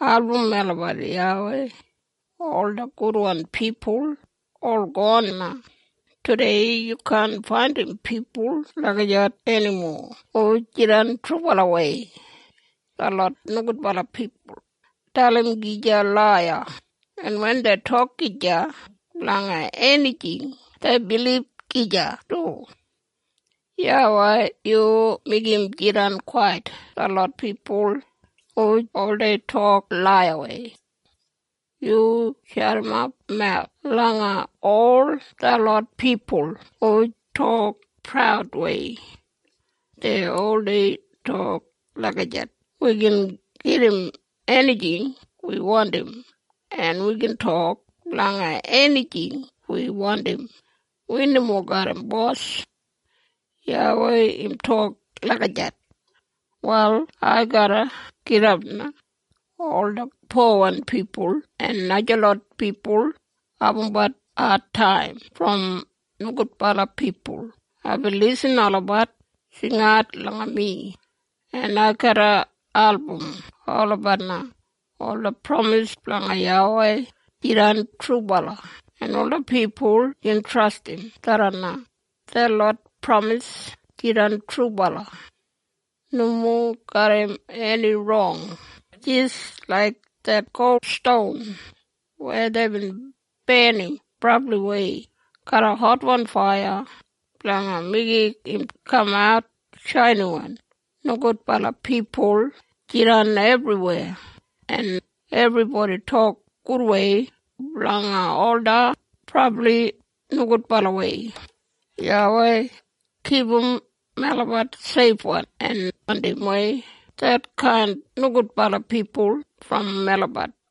Album melabat YAWEI! Ola gudwan pipul ol gon na. Tudei yu kaan faindim pipul lagijat enimo hu jidan trubalawei. Detlot nogudbala pipul dalim gija laiya. En wen dei tok gija blanga enijing dei bilib gija du. YAWEI yu meigim jidan kwait detlot pipul hu oldei tok laiyawei. Yu jadimap mawus blanga ol detlot pipul hu tok praudwei. Dei oldei tok lagijat, “Wi gin gedim enijing wi wandim, en wi gin tok blanga enijing wi wandim. Wi nomo garram bos.” YAWEI im tok lagijat, “Wal ai garra gidap na. Ola powan pipul en najalot pipul abumbat adtaim brom nogudbala pipul. Aibin lisin olabat jingat langa mi, en ai garra album olabat na.” Ola pramis blanga YAWEI jidan trubala en ola pipul gin trastim tharran na. Detlot pramis jidan trubala, nomo garram eni rong, jis laik det gol ston weya deibin barnim brabliwei garram hotwan faiya blanga meigim im kamat klinwan. Nogudbala pipul jidan ebriweya, en ebribodi tok gudwei blanga ola brabli nogudbalawei. YAWEI, kipum melabat seifwan, en andimwei detkain nogudbala pipul brom melabat.